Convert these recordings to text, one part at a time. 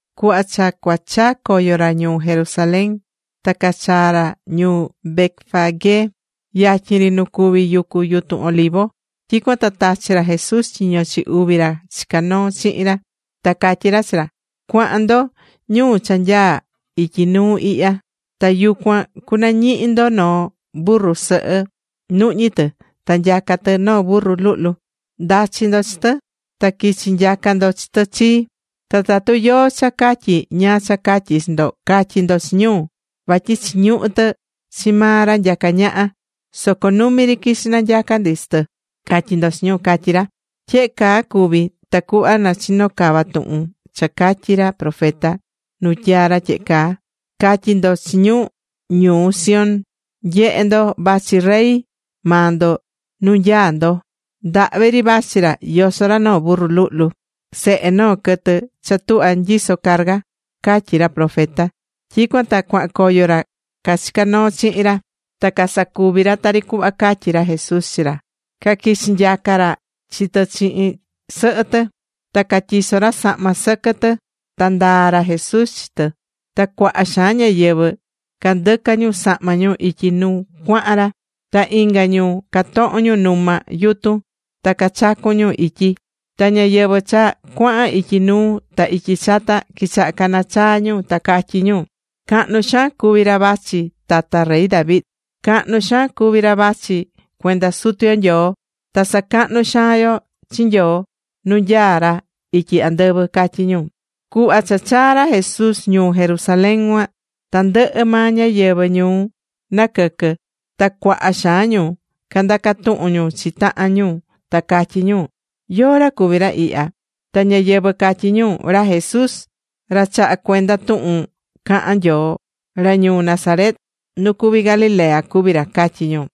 Cuhva cha cua chaa̱ coyo ra ñuu Jerusalén, ta cachaa̱ ra ñuu Betfagé, yatyin ri nu cuví yucu yutun Olivo. Tyicuan ta tachi̱ ra Jesús tyiño chi uvi ra chicá noo chihin ra. Ta catyí ra chi ra: ―Cua̱han ndo ñuu cha nyaá ityi nuu ihya. Ta yucuan cunañihi ndo noo burru sɨhɨ, nuhñí tɨ. Ta nyacá tɨ noo burru luhlu. Nda̱chi ndo chi tɨ, ta qui̱chi nyaca ndo chi tɨ chii. Ta tatu yóó cha catyí ñáá cha catyí chi ndo, ca̱tyi ndo chi ñu: “Vatyi chiñuhú tɨ chi maa ra nyacá ñaha, soco numi ri quichi nanyaca ndi chi tɨ”, ca̱tyi ndo chi ñu ―catyí ra. Tyehe caa cuvi̱ tacuhva na chino cava tuhun cha catyí ra profeta nu tyaa̱ ra tyehe caa: Ca̱tyi ndo chi ñu ñuu Sión: “Nye̱he ndo, vachi rey maa ndo nu nyaá ndo. Ndahvi ri vachi ra yosó ra noo burru luhlu, sehe noo quɨtɨ cha tuhvá nyisó carga”, catyí ra profeta. Tyicuan ta cuahan coyo ra cachicá noo chihin ra, ta casacuvi̱ ra tari cuhva catyi̱ ra Jesús chi ra. Caquichi̱ nyaca ra chi tɨ chihin sɨhɨ tɨ. Ta catyiso̱ ra sahma ra sɨquɨ tɨ, ta ndaa̱ ra Jesús chi tɨ. Ta cuaha xaan ñáyɨvɨ candɨca̱ ñu sahma ñu ityi nu cuahan ra, ta inga ñu catoho̱n ñu numa yutun ta cachacu̱n ñu ityi. Ta ñáyɨvɨ cha cuahan ityi nuu ta ityi chata, quichaha̱ cana chaa ñu ta catyí ñu: ―¡Cahnu xaan cuví ra vachi tata rey David! ¡Cahnu xaan cuví ra vachi cuenda Sutu yo Nyoo! ¡Ta sacahnú xaan yo chi Nyoo nu nyaá ra ityi andɨvɨ! ―catyí ñu. Cuhva cha chaa̱ ra Jesús ñuu Jerusalén cuan, tandɨhɨ maa ñáyɨvɨ ñuu naquɨquɨ̱, ta cuaha xaan ñu candacá tuhun ñu chi tahan ñu, ta catyí ñu: ―¿Yóó ra cuví ra ihya? Ta ñáyɨvɨ catyí ñu: ―Ra Jesús, ra chahá cuenda tuhun cahan Nyoo, ra ñuu Nazaret nu cuví Galilea cuví ra ―catyí ñu.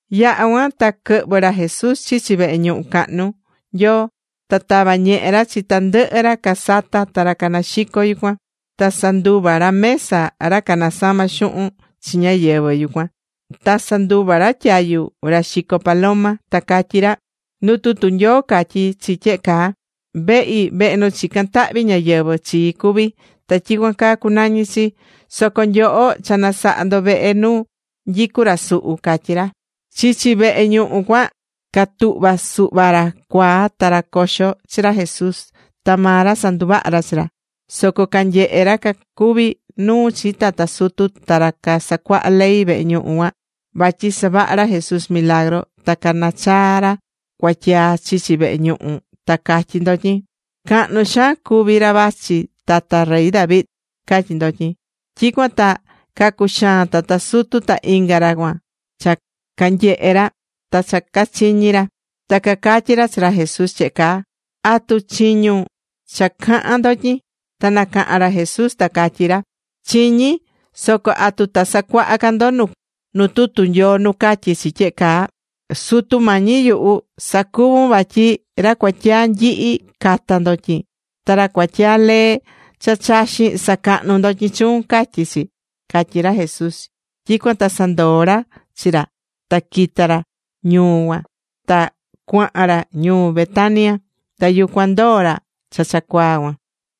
Yaha̱ cuan ta quɨhvɨ̱ ra Jesús chichi vehe ñuhu cahnu Nyoo. Ta tava̱ ñehe ra chi tandɨhɨ ra casatá ta ra caxicó yucuan. Ta sanduva̱ ra mesa ra canasamá xuhun chi ñáyɨvɨ yucuan. Ta sanduva̱ ra tyayu ra caxicó paloma. Ta catyí ra: ―Nu tutu Nyoo catyí chi tyehe caa: “Vehi, vehe nu chicán tahvi ñáyɨvɨ chii cuví, ta tyicuan caa cucunañi chi. Soco nyoho cha nasaha̱ ndo vehe nu nyicú ra suhu” ―catyí ra. Chichi vehe ñuhu cuan catuhva̱ suhva ra cuaa ta ra coxo chi ra Jesús. Ta maa ra sanduvaha̱ ra chi ra. Soco canyehe̱ ra cacuví nuu chi tata sutu ta ra casacuahá ley vehe ñuhu cuan vatyi savaha̱ ra Jesús milagru, ta canachaa̱ ra cuatyaa chichi vehe ñuhu, ta catyí ndotyin: ―¡Cahnu xaan cuví ra vachi tata rey David! ―catyí ndotyin. Tyicuan ta cacuxaa̱n tata sutu ta inga ra cuan cha canyehe̱ ra ta cha cachiñi̱ ra. Ta cacatyí ra chi ra Jesús tyehe caa: ―¿Atu chiñún cha cahán ndotyin? Ta nacaha̱n ra Jesús ta catyí ra: ―Chiñí. Soco ¿atu ta sacuaha ca ndo nu tutu Nyoo nu catyí chi tyehe caa? Sutu Mañi yuhu, sacuvu̱n vatyi ra cuatyaa nyihi cata ndotyin. Ta ra cuatyaa lee cha chaxín sacahnú ndotyin chuun, catyí chi, ―catyí ra Jesús. Tyicuan ta sandoo̱ ra chi ra, ta quita̱ ra ñuu cuan ta cuahan ra ñuu Betania. Ta yucuan ndoo̱ ra cha cuaa cuan.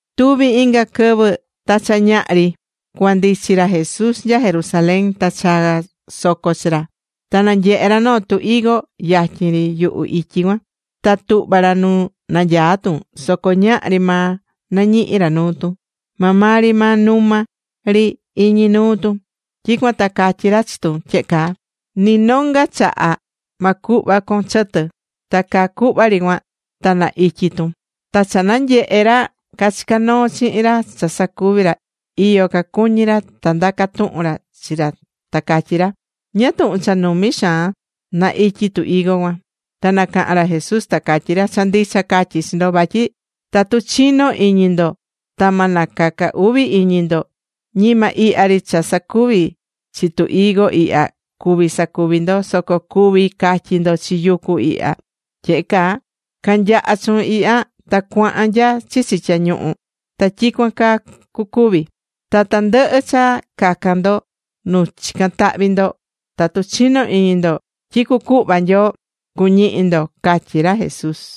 Tuvi inga quɨvɨ. Ta cha ñaha ri, cua ndichi ra Jesús nya Jerusalén, ta chaa̱ soco chi ra. Ta nanyehe̱ ra noo tu higo yatyin ri yuhu ityi cuan. Ta tuhva̱ ra nu nanyaá tun, soco ñahri maa nañihi ra nuu tun. Maa maa ri maa numa ri iñi nuu tun. Tyicuan ta catyi̱ ra chi tun tyehe caa: ―¡Ni nonga chaha ma cuhva con chɨtɨ! Ta caa cuhva ri cuan ta na ityi tun. Ta cha nyehe̱ ra cachicá noo chihin ra cha sacuvi̱ ra, iyo cacuñí ra, ta ndaca̱ tuhun ra chi ra ta catyí ra: ―¿Ñáá tuhun cha numi xaan na ityi tu higo cuan? Ta nacaha̱n ra Jesús ta catyí ra: ―Cha ndicha catyí chi ndo, vatyi tatu chinó iñi ndo ta ma nacaca uvi iñi ndo, ñima ihya ri cha sacuvi̱ chi tu higo ihya cuví sacuvi ndo, soco cuví catyi ndo chi yucu ihya tyehe caa: “Ca̱nyaha chuun ihya ta cua̱han nya chichi tyañuhu.” Ta tyicuan caa cucuvi. Ta tandɨhɨ cha cacan ndo nu chicán tahvi ndo, tatu chinó iñi ndo tyi cucuhva Nyoo, cuñihi ndo ―catyí ra Jesús.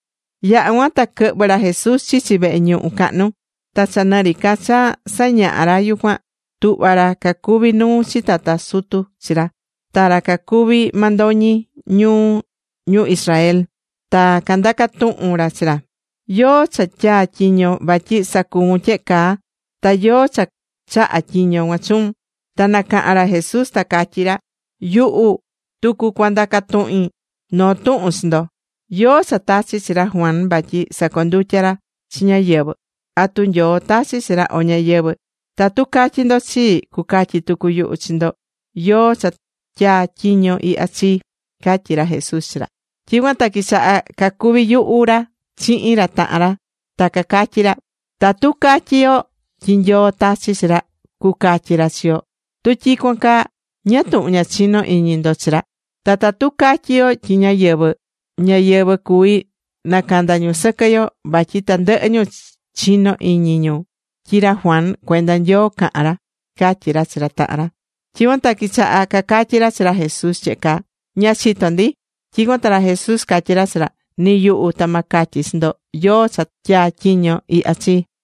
Yaha̱ cuan ta quɨhvɨ̱ ra Jesús chichi vehe ñuhu cahnu, ta cha nɨ ri ca cha sañahá ra yucuan, tuhva̱ ra cacuví nuu chi tata sutu chi ra, ta ra cacuví mandoñi ñu ñuu Israel, ta candaca̱ tuhun ra chi ra: ―¿Yóó cha tyaa̱ tyiño vatyi sacuvun tyehe caa, ta yóó cha chaha̱ tyiño cuan chuun? Ta nacaha̱n ra Jesús ta catyí ra: ―Yuhu tucu cua ndaca tuhin noo tuhun chi ndo. ¿Yóó cha tachi̱ chi ra Juan vatyi sacondutya ra chi ñáyɨvɨ? ¿Atu Nyoo tachi̱ chi ra, o ñáyɨvɨ? Tatu catyi ndo chii, cucatyi tucu yuhu chi ndo yóó cha tyaa̱ tyiño ihya chii ―catyí ra Jesús chi ra. Tyicuan ta quichaha̱ cacuvi yuhu ra chihin ra tahan ra, ta cacatyí ra: ―Tatu catyí yo tyi Nyoo tachi̱ chi ra, cucatyi ra chi yo: “Tu tyicuan caa, ¿ñáá tuhun ña chinó iñi ndo chi ra?” Ta tatu catyí yo tyi ñáyɨvɨ, ñáyɨvɨ cuví nacanda ñu sɨquɨ yo, vatyi tandɨhɨ ñu chinó iñi ñu tyi ra Juan, cuenda Nyoo caha̱n ra ―catyí ra chi ra tahan ra. Tyicuan ta quichaha̱ cacatyí ra chi ra Jesús tyehe caa: ―Ña chitó ndi. Tyicuan ta ra Jesús catyí ra chi ra: ―Ni yuhu, ta ma catyi chi ndo yóó cha tyaa tyiño ihya chii.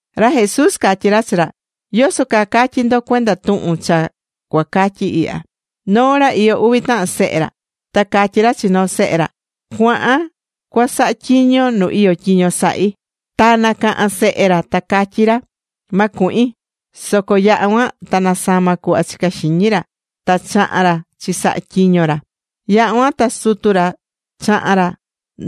Ra Jesús catyí ra chi ra: ―¿Yoso caa catyí ndo cuenda tuhun cha cua catyi ihya? Noo ra, iyó uvi tahan sehe ra. Ta catyí ra chi noo sehe ra: “Cua̱han cua saha tyiño nu iyó tyiño sahí.” Ta nacaha̱n sehe ra ta catyí ra: “¡Ma cuhin!” Soco yaha̱ cuan ta nasama̱ cuhva chicá xiñi ra ta chaha̱n ra chisaha tyiño ra. Yaha̱ cuan ta sutu ra chaha̱n ra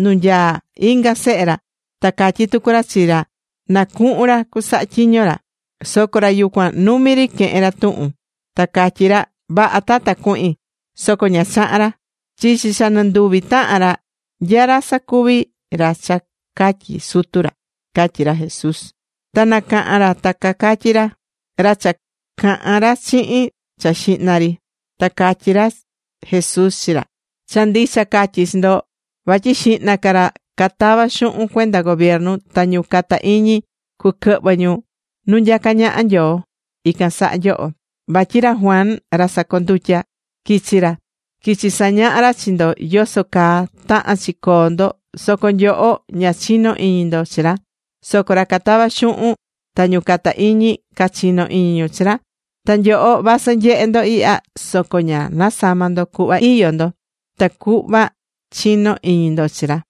nu nyaá inga sehe ra. Ta catyí tucu ra chi ra na cuhun ra cusaha tyiño ra. Soco ra yucuan numi ri quehe̱n ra tuhun, ta catyí ra: “Vaha, Tata, cuhin.” Soco ña chaha̱n ra. Chichi cha nɨnduvi tahan ra, ¿nya ra sacuvi̱ ra cha catyi̱ sutu ra? ―catyí ra Jesús. Ta nacaha̱n ra ta cacatyí ra: ―Ra cha caha̱n ra chihin cha xihna ri. Ta catyí ra Jesús chi ra: ―Cha ndicha catyí chi ndo, vatyi xihna ca ra catavá xuhun cuenda gobiernu, ta ñu cata iñi cuquɨhvɨ ñu nu nyacá ñaha Nyoo, ican saha nyoho. Vatyi ra Juan ra sacondutya quichi̱ ra, quichi sañaha ra chi ndo yoso caa tahán chi coo ndo, soco nyoho ña chino̱ iñi ndo chi ra, soco ra catavá xuhun ta ñu cata iñi cachino̱ iñi ñu chi ra. Ta nyoho vasɨ nyehe̱ ndo ihya, soco ña nasama̱ ndo cuhva iyó ndo, tacuhva chino iñi ndo chi ra.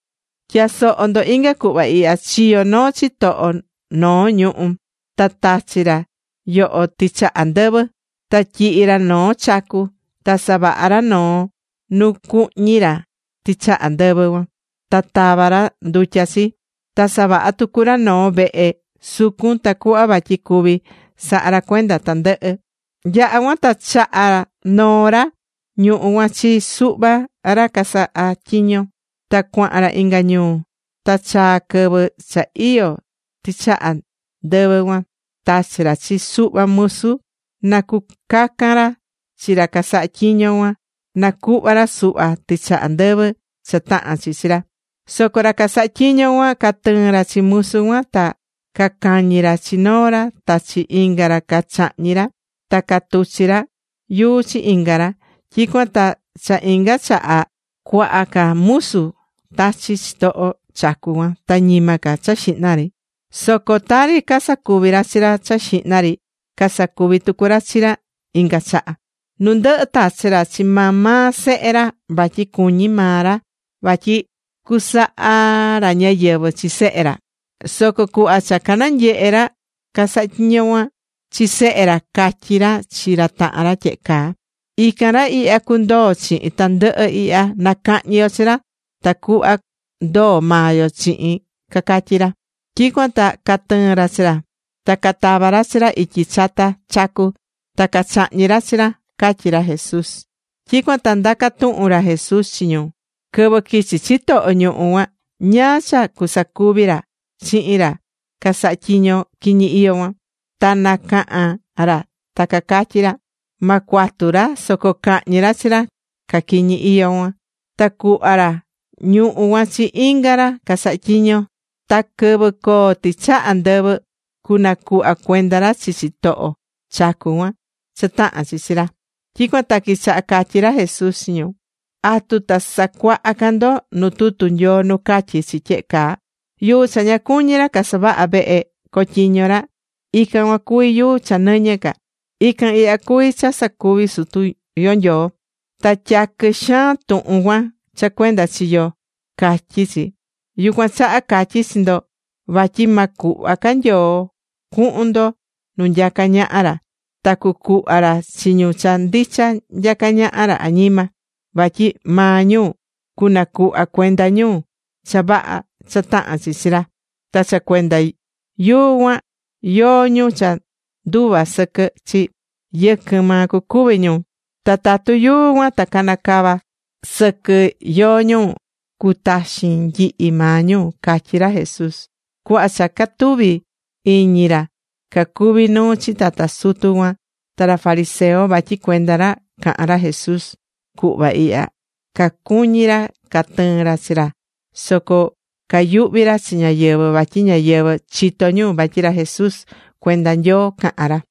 ’Tya̱soho ndo inga cuhva ihya: Chiyo̱ noo chitoho noo ñuhú, ta tachi ra yoho tɨchaha ndɨvɨ, ta tyihi̱ ra noo chacu. Ta savaha̱ ra noo nu cuhñi ra tɨchaha ndɨvɨ cuan ta tava ra ndutya chi. Ta savaha̱ tucu ra noo vehe sucun tacuhva vatyi cuvi saha ra cuenda tandɨhɨ. ’Yaha̱ cuan ta chaha̱ noo ra ñuhú cuan chi suhva ra casahá tyiño, ta cuahan ra inga ñuu. Ta cha chaa̱ quɨvɨ cha iyó tɨchaha ndɨvɨ cuan, tachi̱ ra chi suhva musu, na cucacan ra chi ra casahá tyiño cuan, na cuhva ra suhva tɨchaha ndɨvɨ cha tahán chi chi ra. Soco ra casaha tyiño cuan, catɨɨ̱n ra chi musu cuan, ta cacañi̱ ra chi noo ra. Ta chi inga ra cachahñi̱ ra, ta catuchi̱ ra yuu chi inga ra. Tyicuan ta cha inga chaha, cuaha ca musu tachi̱ chitoho chacu cuan ta ñima ca cha xihna ri. Soco tari casacuvi̱ ra chi ra cha xihna ri, sacuvi̱ tucu ra chi ra ihya. ’Nu ndɨhɨ tachi̱ ra chi maa maa sehe ra, vatyi cuñí maa ra vatyi cusaha ra ñáyɨvɨ chi sehe ra. Soco cuhva cha cananyehe̱ ra casahá tyiño cuan chi sehe ra, catyí ra chi ra tahan ra tyehe caa: “Ican ra ihya cundoo chihin tandɨhɨ ihya. Na cahñi yo chi ra tacuhva ndoo maa yo chihin”, cacatyí ra. Tyicuan ta catɨɨ̱n ra chi ra, ta catava̱ ra chi ra ityi chata chacu, ta cachahñi̱ ra chi ra ―catyí ra Jesús. Tyicuan ta ndaca̱ tuhun ra Jesús chi ñu: ―Quɨvɨ quichi chitoho ñuhú cuan, ¿ñáá cha cusacuvi ra chihin ra casahá tyiño quiñi iyó cuan? Ta nacaha̱n ra ta cacatyí ra: ―Ma cuatu ra, soco cahñi ra chi ra caquiñi iyó cuan. Ta cuhva ra ñuhú cuan chi inga ra casahá tyiño. Ta quɨvɨ coo tɨchaha ndɨvɨ, cunacuhva cuenda ra chi chitoho chacu cuan cha tahán chi chi ra. Tyicuan ta quichaha catyí ra Jesús chi ñu: ―¿Atu ta sacuaha ca nyoho nu tutu Nyoo nu catyí chi tyehe caa? Yuu cha ña cuñi̱ ra casavahá vehe cotyiño ra, ican cuan cuví yuu cha nɨñɨ ca. Ican ihya cuví cha sacuvi̱ Sutu yo Nyoo. Ta tyaquɨ xaan tuhun cuan cha cuenda chi yo, catyí chi. ’Yucuan chaha catyí chi ndo vatyi ma cuhva ca Nyoo cuhun ndo nu nyacá ñaha ra, ta cucuhva ra chi ñu cha ndicha nyacá ñaha ra añima. Vatyi maa ñu cunacuhva cuenda ñu cha vaha cha tahán chi chi ra. Ta cha cuenda yuu cuan, yóó ñu cha nduva sɨquɨ chi, yɨquɨn maa cucuvi ñu. Ta tatu yuu cuan ta canacava sɨquɨ yóó ñu, cutaxin nyihi maa ñu ―catyí ra Jesús. Cuhva cha catuvi̱ iñi ra cacuví nuu chi tata sutu cuan ta ra fariseo vatyi cuenda ra caha̱n ra Jesús cuhva ihya, cacuñí ra catɨɨn ra chi ra, soco cayuhvi ra chi ñáyɨvɨ vatyi ñáyɨvɨ, chitó ñu vatyi ra Jesús cuenda Nyoo cahán ra.